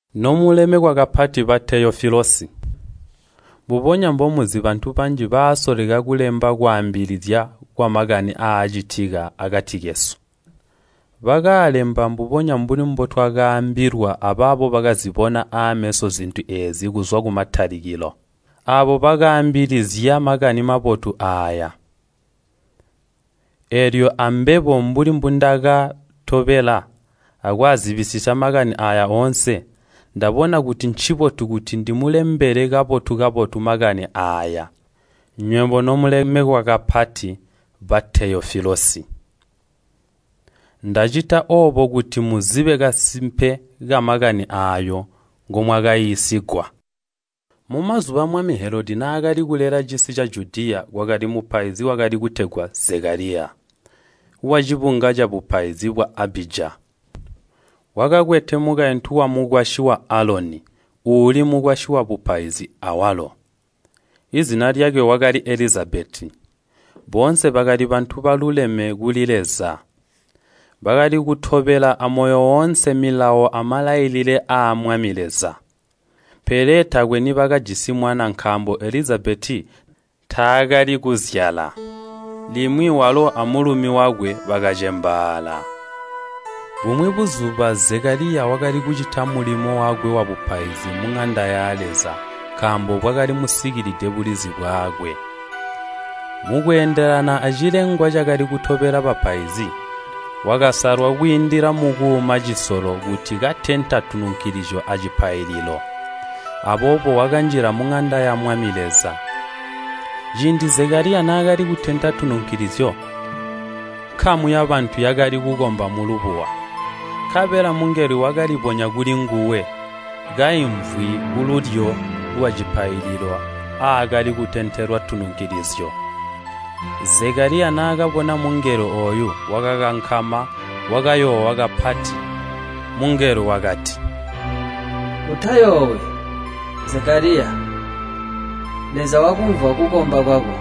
Nomuyandwa ba Teyofilusi, Mbubonya mbomuzi bantu banji basoleka kulemba kwaambilizya kwamakani aacitika akati kesu. Bakaalemba mbubonya mbuli mbotwakaambilwa abaabo bakazibona aameso zintu eezi kuzwa kumatalikilo. Aabo bakaambilizya Makani Mabotu aaya. Eelyo ambebo, mbuli mbundakaatobela akwaazibisisya makani aaya oonse, ndabona kuti ncibotu kuti ndimulembele kabotu-kabotu makani aaya, nywebo nomulemekwa kapati, ba Teyofilusi. Ndacita oobo kuti muzibe kasimpe kamakani aayo ngomwakaiisigwa. Mumazuba mwami Helodi naakali kulela cisi ca Judiya kwakali mupaizi wakali kutegwa Zekaliya, wacibunga cabupaizi bwa Abija. Wakakwete mukaintu wamukwasyi wa Aloni, uuli mukwasyi wabupaizi awalo. Izina lyakwe wakali Elizabeti. Boonse bakali bantu baluleme kuli Leza. Bakali kutobela amoyo woonse milawo amalailile aa Mwami Leza. Pele taakwe nibakajisi mwana nkaambo Elizabeti taakali kuzyala. Limwi walo amulumi wakwe bakacembaala. Bumwi buzuba Zekaliya wakali kucita mulimo wakwe wabupaizi muŋanda ya Leza, nkaambo bwakali musikilide bulizi bwakwe, mukweendelana acilengwa cakali kutobela bapaizi. Wakasalwa kwiindila mukuuma cisolo kuti katenta tununkulizyo acipaililo. Aboobo wakanjila muŋanda ya Mwami Leza. Ciindi Zekaliya naakali kutenta tununkilizyo, nkamu yabantu yakali kukomba mulubuwa. Nkabela mungelo wakalibonya kulinguwe, kaimvwi kululyo lwacipaililo aakali kutentelwa tununkilizyo. Zekaliya naakabona mungelo ooyo, wakakankama, wakayoowa kapati. Mungelo wakati, “Utayoowi, Zekaliya! Leza wakumvwa kukomba kwako.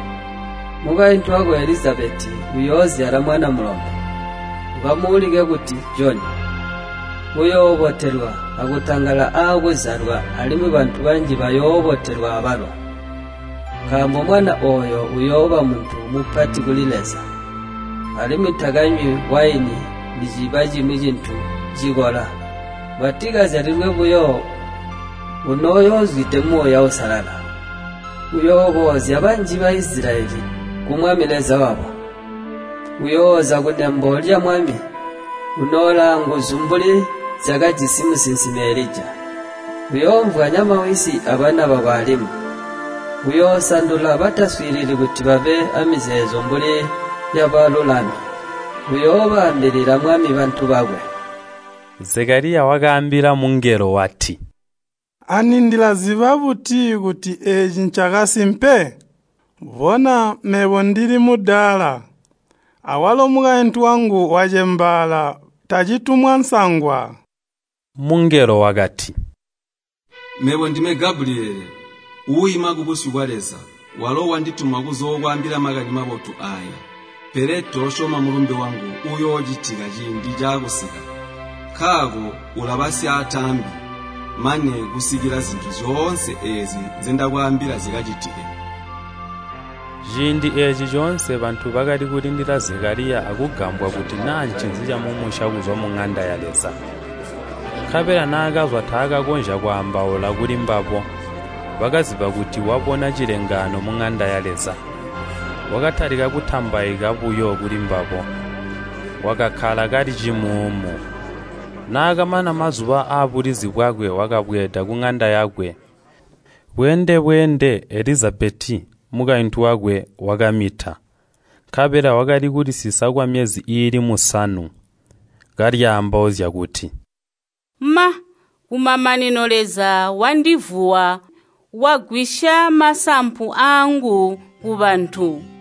Mukaintu wako Elizabeti uyoozyala mwana mulombe. Ukamuulike kuti Joni. Uyoobotelwa akutangala aakuzyalwa, alimwi bantu banji bayoobotelwa abalo. Nkaambo mwana ooyo uyooba muntu mupati kuli Leza, alimwi takanywi waini niciba cimwi cintu cikola, mbwatikazyalilwe buyo, unoyoozwide Muuya Uusalala. Uyooboozya banji ba Baisilayeli ku Mwami Leza wabo. Uyoosololwedwa a Mwami, unooli aanguzu mbuli zyakajisi musinsimi Elija. Uyoomvwanya mawisi abana babo alimwi. Uyoosandula bataswiilili kuti babe aamizeezo mbuli yabalulami. Uyoobambilila Mwami bantu bakwe.” Zekaliya wakaambila mungelo wati, “Ani ndilaziba buti kuti eeci ncakasimpe? Bona mebo ndili mudaala, awalo mukaintu wangu wacembaala tacitumwa nsangwa.” Mungelo wakati, “Mebo ndime Gabuliyele, uuima kubusyu bwa Leza. Walo wandituma kuzookwaambila makani mabotu aaya. Pele toosyoma mulumbe wangu ooyo uuyocitika ciindi caakusika. Nkaako ulaba syaataambi mane kusikila zintu zyoonse eezi nzendakwaambila zikacitike.” Ciindi eeci coonse bantu bakali kulindila Zekaliya akugambwa kuti naa ncinzi camumusya kuzwa muŋanda ya Leza. Nkabela naakazwa taakakonzya kwaambaula kulimbabo, bakaziba kuti wakabona cilengaano muŋanda ya Leza. Wakatalika kutambaika buyo kulimbabo. Wakakkala kali cimuumu. Naakamana mazuba aabulizi bwakwe, wakabweeda kuŋanda yakwe. Bweende-bweende Elizabeti, mukaintu wakwe, wakamita, nkabela wakali kulisisa kwamyezi iili musanu, kalyaambauzya kuti, “Ma, kumamanino Leza wandivuwa wagwisya masampu aangu kubantu.”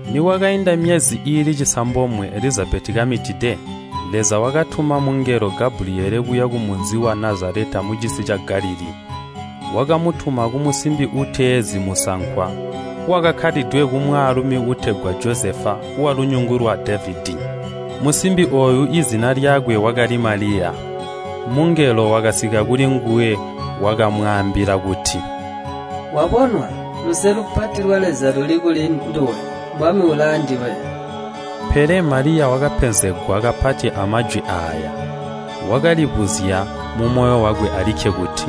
Nikwakainda myezi iili cisambomwe Elizabeti kamitide, Leza wakatuma Gabuliyele kuya kumunzi wa Nazaleta mucisi ca Galilii. Wakamutuma kumusimbi uutezi musankwa wakakkalidwe kumwaalumi uutegwa Josefa walunyungu lwa Devedi. Musimbi ooyo izina lyakwe wakali Maliya. Mungelo wakasika kulinguwe wakamwaambila kuti, “Wabonwa, luse lupati lwa Leza luli kuli nduwe, Mwami uli aanduwe!” Pele Maliya wakapenzegwa kapati amajwi aaya. Wakalibuzya mumoyo wakwe alikke kuti,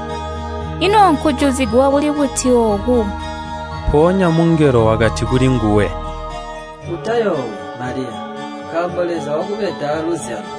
“Ino nkujuzigwa kuli buti ooku?” Mpoonya mungelo wakati kulinguwe, “Utayoowi, Maliya, nkaambo Leza wakubeda aaluzyalo.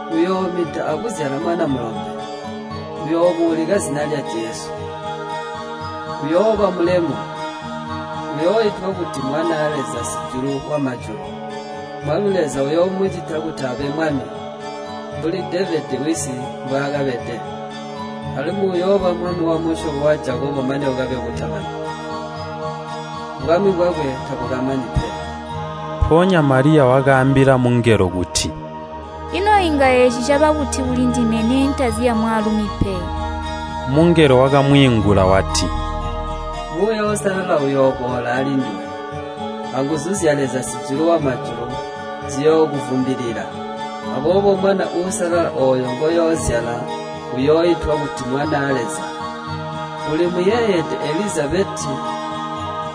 Uyoomita akuzyala mwana mulombe, uyoomuulika zina lya Jesu. Uyooba mulemu, uyooitwa kuti Mwanaa Leza Sijulu wamajulu. Mwami Leza uyoomucita kuti abe mwami, mbuli Devedi wisi mbwaakabede. Alimwi uyooba mwami wamusyobo wa Jakobo mane kukabe kutamani. Bwami bwakwe tabukamani pe!” Mpoonya Maliya wakaambila mungelo kuti, “Ino inga eeci caba buti kulindime neentazi amwaalumi pe?” Mungelo wakamwiingula wati, “Muuya Uusalala uyooboola alinduwe, anguzu zya Leza Sijulu wamajulu ziyookuvumbilila. Aboobo mwana uusalala ooyo ngoyoozyala, uyooitwa kuti Mwanaa Leza. Uli muyeeyede Elizabeti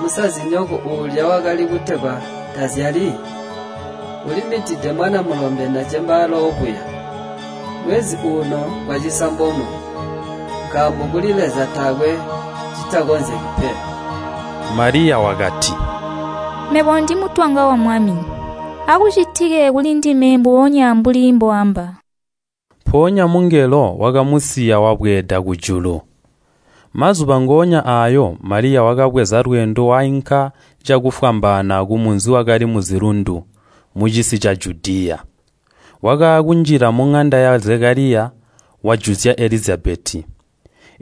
musazinyoko, uulya wakali kutegwa tazyali? Ulimitide mwana mulombe nacembaala oobuya, mwezi uuno ngwacisambomwe. Nkaambo kuli Leza taakwe citakonzeki pe!” Maliya wakati, “Mebo ndimutwanga wa Mwami, akucitike kulindime mbubonya mbuli mbooamba.” Mpoonya mungelo wakamusiya wabweeda kujulu. Mazuba ngoonya aayo, Maliya wakabweza lweendo wainka cakufwambaana kumunzi wakali muzilundu, mucisi ca Judiya. Wakaakunjila muŋanda ya Zekaliya, wajuzya Elizabeti.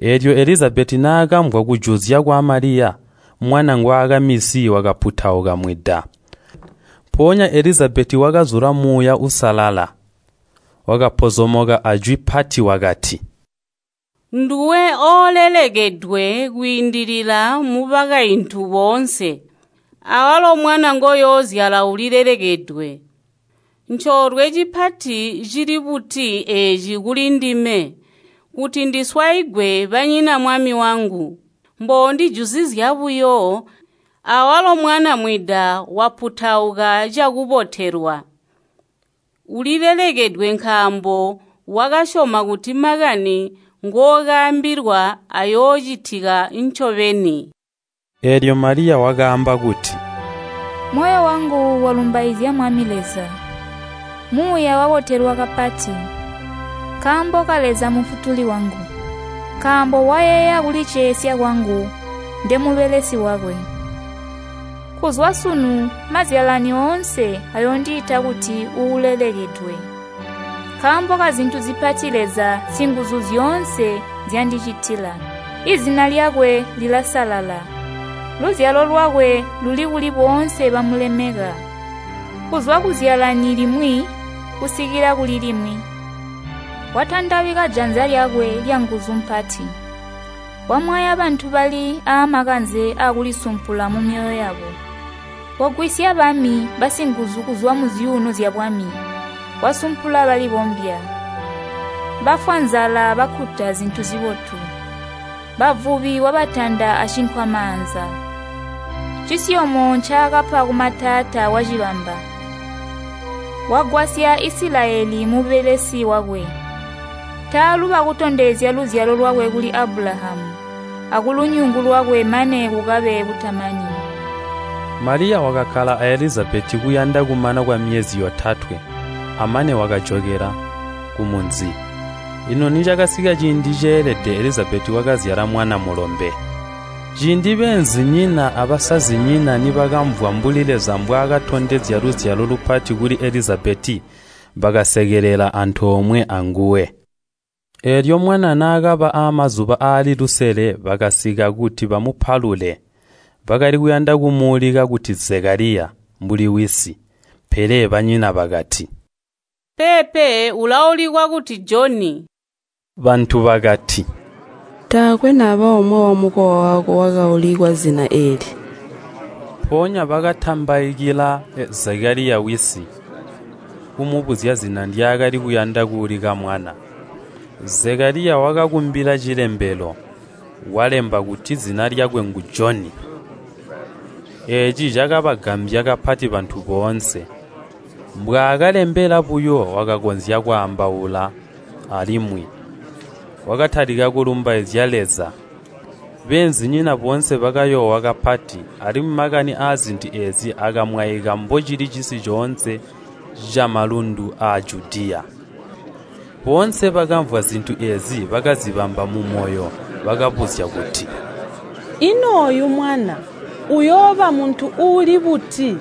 Eelyo Elizabeti naakamvwa kujuzya kwa Maliya, mwana ngwaakaminsi wakaputauka mwida. Mpoonya Elizabeti wakazula Muuya Uusalala, wakapozomoka ajwi pati wakati, “Nduwe oolelekedwe kwiindilila mubakaintu boonse. Awalo mwana ngoyoozyala ulilelekedwe! Ncoolwe cipati cili buti eeci kuli ndime, kuti ndiswaigwe banyina Mwami wangu? Mboondijuzizya buyo, awalo mwana mwida waputauka cakubotelwa. Ulilelekedwe nkaambo wakasyoma kuti makani ngookaambilwa ayoocitika ncobeni.” Eelyo Maliya wakaamba kuti, “Moyo wangu walumbaizya Mwami, Muuya wabotelwa kapati, nkaambo ka Leza Mufutuli wangu. Nkaambo wayeeya kulicesya kwangu ndemubelesi wakwe! Kuzwa sunu mazyalani oonse ayoondiita kuti uulelekedwe. Nkaambo kazintu zipati Leza Singuzuzyoonse nzyaandicitila. Izina lyakwe lilasalala, luzyalo lwakwe luli kuli boonse bamulemeka, kuzwa kuzyalani limwi kusikila kuli limwi. Watandabika janza lyakwe lyanguzu mpati, wamwaya bantu bali aamakanze aakulisumpula mumyoyo yabo. Wagwisya bami basinguzu kuzwa muzyuuno zyabwami, wasumpula balibombya. Bafwa nzala bakkuta zintu zibotu, Bavubi wabatanda acinkwamaanza. Cisyomyo ncaakapa kumatata wacibamba, wagwasya Isilayeli mubelesi wakwe, taaluba kutondezya luzyalo lwakwe kuli Abulahamu, akulunyungu lwakwe mane kukabe kutamani!” Maliya wakakkala a Elizabeti kuyanda kumana kwamyezi yotatwe, amane wakajokela kumunzi. Lino nicakasika ciindi ceelede Elizabeti wakazyala mwana mulombe. Ciindi beenzinyina abasazinyina nibakamvwa mbuli Leza mbwakatondezya luzyalo lupati kuli Elizabeti, bakasekelela antoomwe anguwe. Eelyo mwana naakaba aamazuba aali lusele bakasika kuti bamupalule, bakali kuyanda kumuulika kuti Zekaliya, mbuli wisi. Pele banyina bakati, “Peepe, ulaulikwa kuti Joni.” Bantu bakati, “Taakwe naba omwe wamukowa wako wakaulikwa zina eeli!” Mpoonya bakatambaikila Zekaliya wisi, kumubuzya zina ndyaakali kuyanda kuulika mwana. Zekaliya wakakumbila cilembelo, walemba kuti, “Zina lyakwe ngu Joni.” Eeci cakabagambya kapati bantu boonse. Mbwaakalembela buyo, wakakonzya kwaambaula alimwi, wakatalika kulumbaizya Leza. Beenzinyina boonse bakayoowa kapati, alimwi makani aazintu eezi akamwaika mbocili cisi coonse camalundu aa Judiya. Boonse bakamvwa zintu eezi bakazibamba mumoyo, bakabuzya kuti, “Ino ooyu mwana uyooba muntu uuli buti?”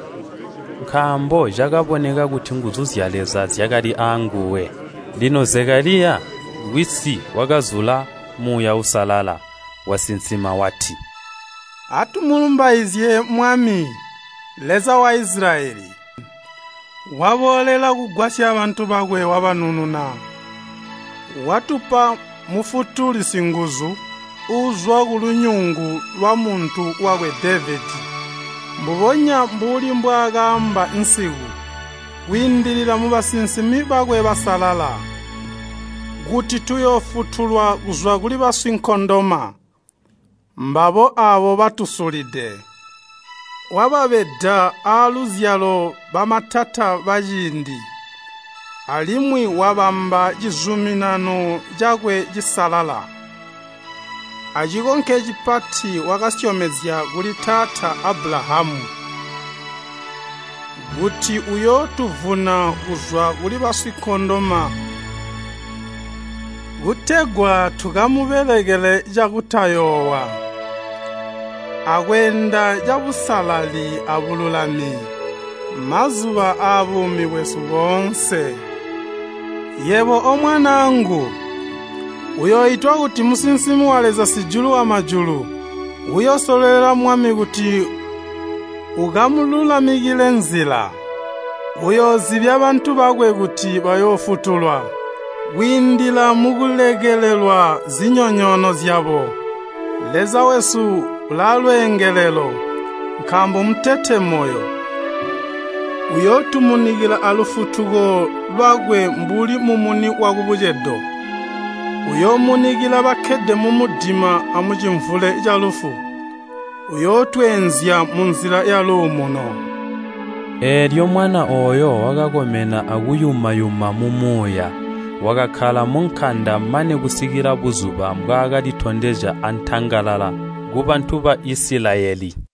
Nkaambo cakaboneka kuti nguzu zya Leza zyakali aanguwe. Lino Zekaliya, wisi wakazula Muuya Uusalala, wasinsima wati, “Atumulumbaizye Mwami, Leza wa Isilayeli! Waboolela kugwasya bantu bakwe wabanununa. Watupa Mufutuli Singuzu, uuzwa kulunyungu lwamuntu wakwe Devedi. Mbubonya mbuli mbwaakaamba nsiku, kwiindila mubasinsimi bakwe basalala. Kuti uyootufutula kuzwa kuli basinkondoma, aabo batusulide. Wakaamba kuti uyootubeda aaluzyalo mbuli mbwaakabeda matata aaciindi, alimwi uyoobamba cizuminano cakwe cisalala. Acikonke cipati wakasyomezya kuli taata Abulahamu, wakasyomezya kuti uyootuvuna kuzwa kuli basinkondoma, kutegwa tukamubelekele cakutayoowa, akweenda cabusalali abululami, mazuba aabuumi bwesu boonse. Yebo, omwanaangu, uyooitwa kuti musinsimi wa Leza Sijulu wamajulu. Uyoosololela Mwami kuti akamululamikile nzila. Uyoozibya bantu bakwe kuti bayoofutulwa, kwiindila mukulekelelwa zinyonyoono zyabo. Leza wesu ulaalwengelelo, nkaambo mmutete moyo, uyootumunikila alufutuko lwakwe mbuli mumuni wakubucedo. Uyoomunikila bakkede mumudima amucimvule calufu. Uyootweenzya munzila yaluumuno.” Eelyo mwana ooyo wakakomena akuyuma-yuma mumuuya. Wakakkala munkanda mane kusikila buzuba mbwaakalitondezya antangalala kubantu ba Isilayeli.